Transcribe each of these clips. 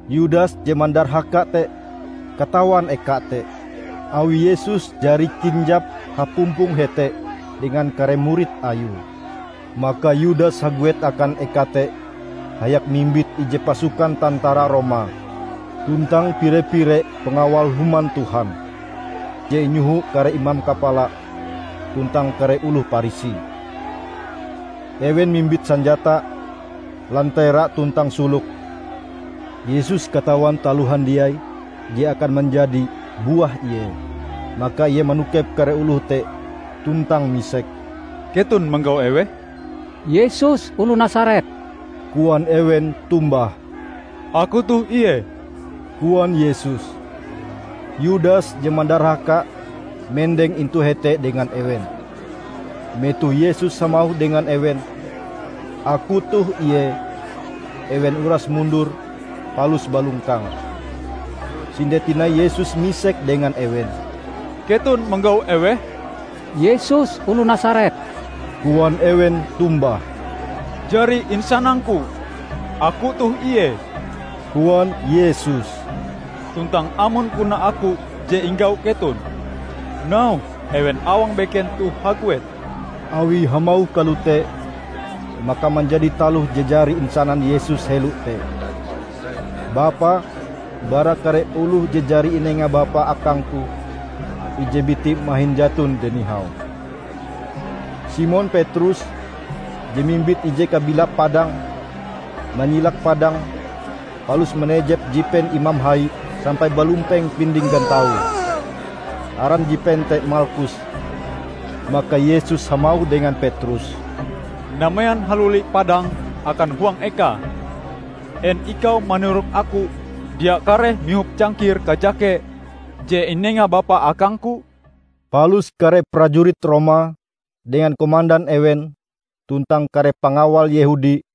Yudas je mandarhaka te, katawan eka te; awi Yesus jari kinjap hapumpong hete dengan kare murid Ayue. Maka Yudas haguet akan eka te hayak mimbit ije pasukan tantara Roma tuntang pire-pire pangawal Human Tuhan je inyoho kare imam kapala tuntang kare oloh Parisi. Ewen mimbit sanjata, lantera tuntang sulok. Yesus katawan taloh handiai je akan manjadi buah Ie. Maka Ie manokep kare oloh te tuntang misek, "Keton manggau eweh?" "Yesus oloh Nasaret," koan ewen tombah. "Aku toh Ie," koan Yesus. Yudas je mandarhaka mendeng intu hete dengan ewen. Metoh Yesus hamauh dengan ewen, "Aku toh Ie," ewen uras mundur palus balongkang. Sinde tinai Yesus misek dengan ewen, "Keton manggau eweh?" "Yesus oloh Nasaret," koan ewen tombah. "Jari insanang-Ku Aku toh Ie," koan Yesus. "Tuntang amon puna Aku je inggau keton, nauhe ewen awang beken toh haguet." ( Awie hamauh kalote, maka manjadi taloh je jari insanan Yesus helo te: "Bapa, bara kare oloh je jari inenga Bapa akang-Ku, ije biti mahin jaton je nihau.") Simon Petrus je mimbit ije kabilap padang, manyilak padange palus manejep jipen imam hai sampai balumpeng pinding gantaue. Aran jipen te Malkus. Maka Yesus hamauh dengan Petrus, "Namean haluli padangm akan huang ekae! En ikau manirok Aku dia kareh mihop cangkir kajake je inenga Bapa akang-Ku?" Palus kare prajurit Roma dengan komandan ewen tuntang kare pangawal Yehudi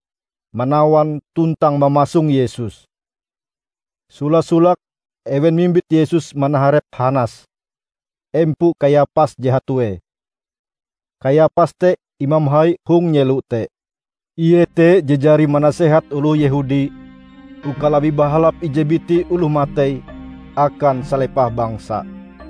manawan tuntang mamasong Yesus. Sola-solake ewen mimbit Yesus manaharep Hanas, empo Kayapas je hatue. Kayapas te imam hai hong nyelo te. Ie te je jari manasehat oloh Yehudi uka labih bahalap ije biti oloh matei akan salepah bangsa.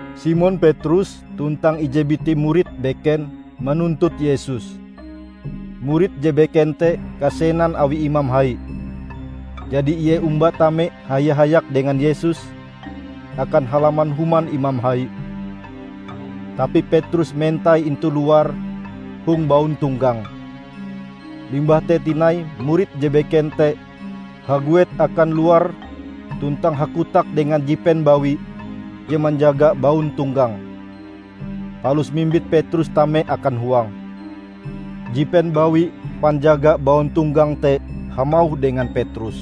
Simon Petrus tuntang ije biti murid beken manuntut Yesus. Murid je beken te kasenan awi imam hai; jadi ie omba tame haya-hayak dengan Yesus akan halaman human imam hai, tapi Petrus mentai intu luar hong bauntonggang. Limbah te tinai murid je beken te haguet akan luar tuntang hakotak dengan jipen bawi je manjaga bauntonggang, palus mimbit Petrus tame akan huang. Jipen bawi panjaga bauntonggang te hamauh dengan Petrus,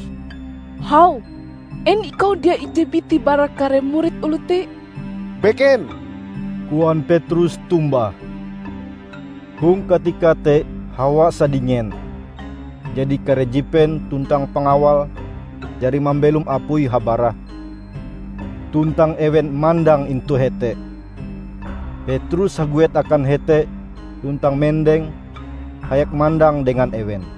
"Hau, en ikau dia ije biti bara kare murid oloh te?" "Beken," koan Petrus tombah. Hong katika te hawa sadingen, jadi kare jipen tuntang pangawal jari mambelom apui habarah tuntang ewen mandang intu hete. Petrus haguet akan hete tuntang mendeng hayak mandang dengan ewen.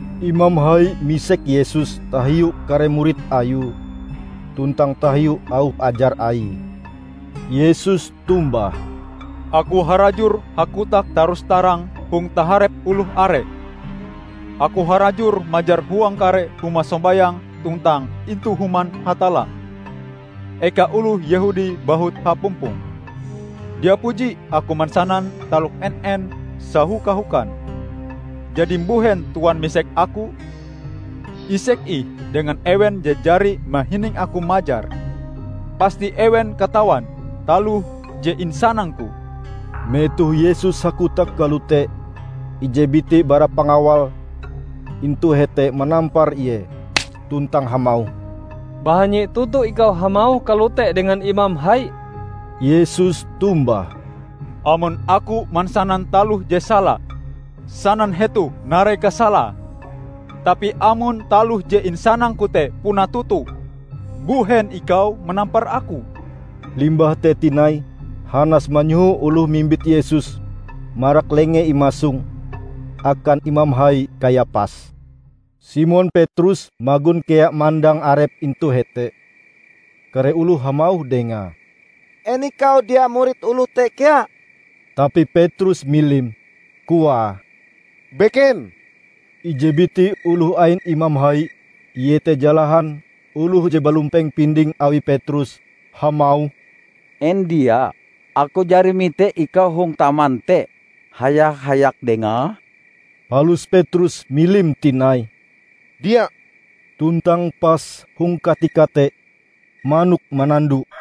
Imam hai misek Yesus tahiu kare murid Ayue tuntang tahiu auh ajar Aie. Yesus tombah, "Aku harajur hakotak tarus-tarang hong taharep oloh are. Aku harajur majar huang kare huma sombayang tuntang intu Human Hatalla, eka oloh Yehudi bahut hapumpong. Dia puji Aku mansanan taloh en-en sahoka-hokan. Jadi mbuhen Tuan misek Aku? Isek ih dengan ewen je jari mahining Aku majar. Pasti ewen katawan taloh je insanang-Ku." Metoh Yesus hakotak kalote, ije biti bara pangawal intu hete manampar Ie tuntang hamauh, "Bahanyi toto ikau hamauh kalote dengan imam hai!" Yesus tombah, "Amon Aku mansanan taloh je sala, sanan hetoh narai kasalae! Tapi amon taloh je insanang-Ku te puna toto, mbuhen ikau manampar Aku?" Limbah te tinai Hanas manyoho oloh mimbit Yesus marak lengee imasong akan Imam Hai Kayapas. Simon Petrus magon kea mandang arepe intu hete. Kare oloh hamauh dengae, "En ikau dia murid oloh te kea?" Tapi Petrus milim, koae, "Beken!" Ije biti oloh ain imam hai, iete jalahan oloh je balumpeng pindinge awi Petrus, hamauh, "En dia Aku jari mite ikau hong taman te haya-hayak dengae?" Palus Petrus milim tinai, "Dia," -- tuntang pas hong katika te manok manando.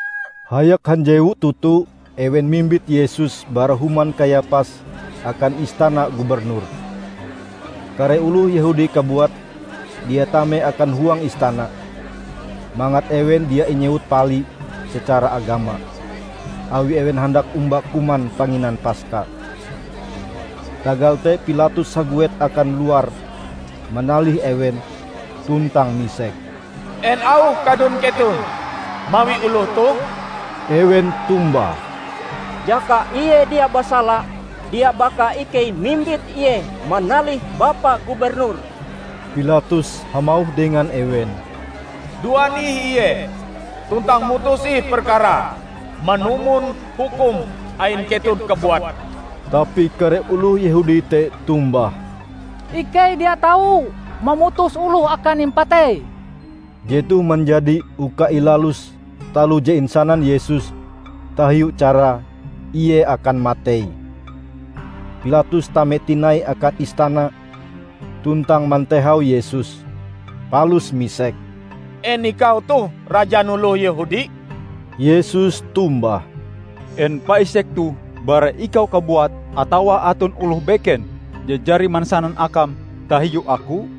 Hayak hanjewu toto ewen mimbit Yesus bara human Kayapas akan istana gubernur. Kare oloh Yehudi kabuat dia tame akan huang istana, mangat ewen dia inyewut pali secara agama, awi ewen handak omba kuman panginan Paska. Tagal te Pilatus haguet akan luar manalih ewen tuntang misek, "En auh kadun keton mawi oloh toh?" Ewen tombah, "Jaka Ie dia basala, dia baka ikei mimbit Ie manalih Bapa Gubernur." Pilatus hamauh dengan ewen, "Duan ih Ie tuntang mutus ih perkarae manumon hukum ain keton kabuat!" Tapi kare oloh Yehudi te tombah, "Ikei dia tau mamutus oloh akan impatei!" ( Jetoh manjadi uka ilalus taloh je insanan Yesus tahiu carae Ie akan matei.) Pilatus tame tinai akan istana tuntang mantehau Yesus, palus misek, "En ikau toh rajan oloh Yehudi?" Yesus tombah, "En paisek toh bara ikau kabuat atawa aton oloh beken je jari mansanan akam tahiu Aku?"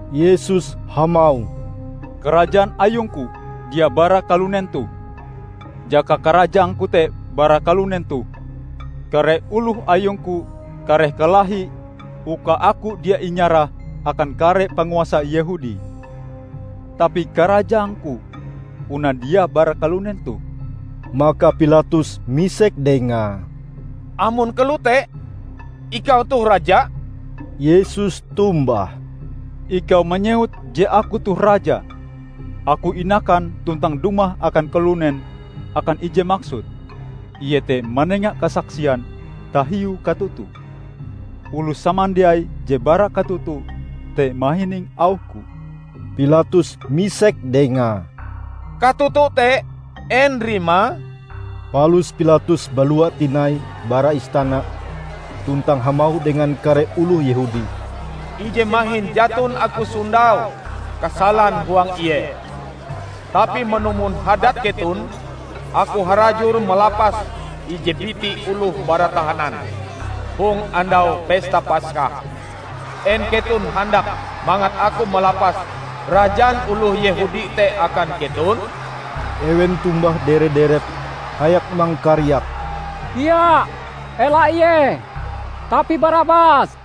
Yesus hamauh, "Karajaan ayung-Ku dia bara kalunen toh. Jaka karajaang-Ku te bara kalunen toh, kare oloh ayung-Ku kareh kalahi uka Aku dia inyarah akan kare panguasa Yehudi. Tapi karajaang-Ku puna dia bara kalunen toh!" Maka Pilatus misek dengae, "Amon kalote, ikau toh raja?" Yesus tombah, "Ikau manyewut je Aku toh raja. Aku inakan tuntang dumah akan kalunen akan ije maksud, iete manenga kasaksian tahiu katoto. Oloh samandiai je bara katoto te mahining auh-Ku." Pilatus misek dengae, "Katoto te en rimae?" Palus Pilatus balua tinai bara istana tuntang hamauh dengan kare oloh Yehudi, "Ije mahin jaton aku sondau kasalan huang Ie. Tapi manumon hadat keton, aku harajur malapas ije biti oloh bara tahanan hong andau Pesta Paska. En keton handak mangat aku malapas rajan oloh Yehudi te akan keton?" Ewen tombah dere-derep hayak mangkariak, "Dia, ela Ie, tapi Barabas!"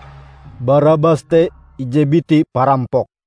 (Barabas te ije biti parampok.)